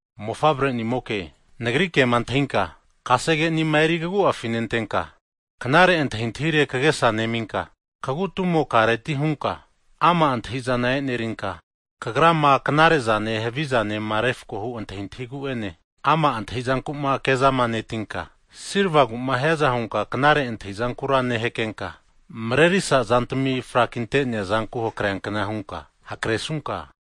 Mofavre'nimoke, nagri kema antahinka kasege'nima eri kagu'afi nentenka, knare antahintahire kagesa neminka, kagu tumokareti hunka ama' antahizana e'nerinka, kagrama knare'zane havizanema refko hu antahintahigu'ene, ama' antahizanku'ma kezama netinka, silvagu'ma hiankna hunka knare antahizankura nehakrenka, marerisa zantami frakinte'nea zanku hakreankna hunka hakresunka,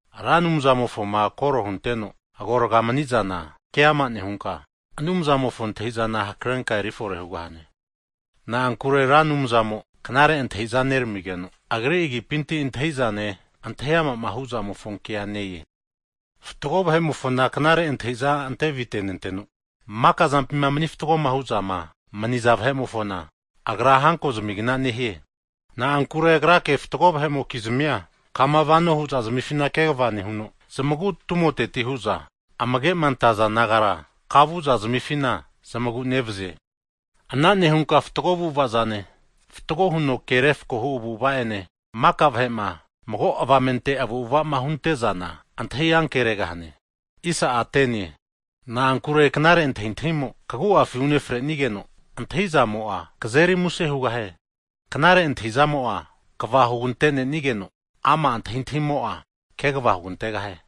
Ra Anumzamofoma kore hunteno agorgama manizana keama nehunka, Anumzamofo antahi'zana hakrenka erifore hugahane. Na'ankure Ra Anumzamo knare antahiza neramigeno, Agri agipinti antahi'zane, antahi amama huzamofo kea ne-e. Fatgo vahe'mofona knare antahiza ante avitenenteno, makazampima mani fatgoma huno mania vahe'mofona, Agra hanko zamigna nehie. Na'ankure Agrake fatgo vahe'mokizmia kama vano hu'zazmifina kegva nehuno, zamagu tumoteti hu'za amage'ma antaza nagara kavu'za zamifina zamagu nevazie. Ana nehunka fatgo avu'avazane, fatgo huno ke refkohu avu'ava ene, maka vahe'ma mago avamente avu'avama hunte'zana antahi ankeregahane. Na'ankure knare antahintahimo kagu'afi unefrenigeno, antahi'zamo'a, kazeri muse hugahie. Knare antahizamo'a kva hugante'nenigeno, ama' antahintahimo'a kaguvazigahie.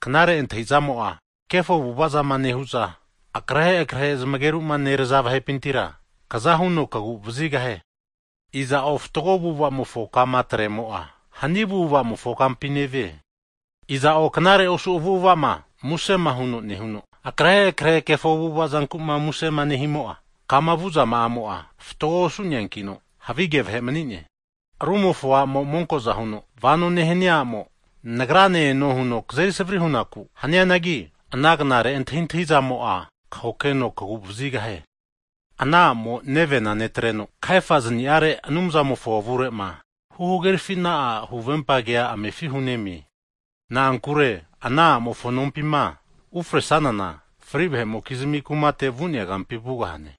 Knare antahizamo'a kefo avu'avazama nehu'za, akrehe krehe zmageruma neraza vahepintira, kaza huno kagu vazigahie. Iza'o fatgo avu'avamofo kama atremo'a, hani avu'avamofo kampi nevie. Iza'o knare osu avu'avama musema huno nehuno, akrehe krehe kefo avu'avazankuma muse nehimo'a, kama vu'zama'amo fatgo osu'neankino, havige vahe manine. Arumofo a'mo monko'za huno vano nehania a'mo, nagrane eno huno kazeri savri hu'naku hanianagi, ana knare antahintahi'zamo'a kahokeno kaguvazigahie. Ana a'mo nevena netreno, kahefazniare Anumzamofo avure'ma huhagerafina'a huvempa kea amefi hunemie. Na'ankure ana a'mofo nompima ufre'sanana, fri vahe'mokizmi kumate vu'nea kampi vugahane.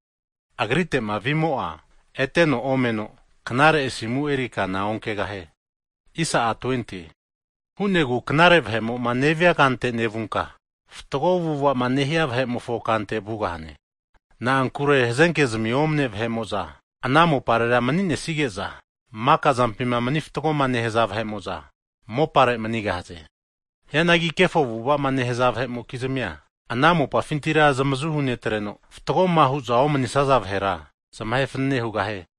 Agrite'ma vimo'a eteno omeno, knare asimu eri kana onkegahie. E'ina hu'negu knare vahe'mo'ma nevia kante nevunka, fatgo avu'avama nehia vahe'mofo kante vugahane. Na'ankure hazenkezmi omane vahe'mo'za ana moparera mni'nesage'za, makazampima mani fatgoma nehaza vahe'mo'za ana mopare manigahaze. Hianagi kefo avu'avama nehaza vahe'mokizmia ana mopafintira zamazu hunetreno, fatgoma hu'za omanisaza vahera zamahe fanane hugahie.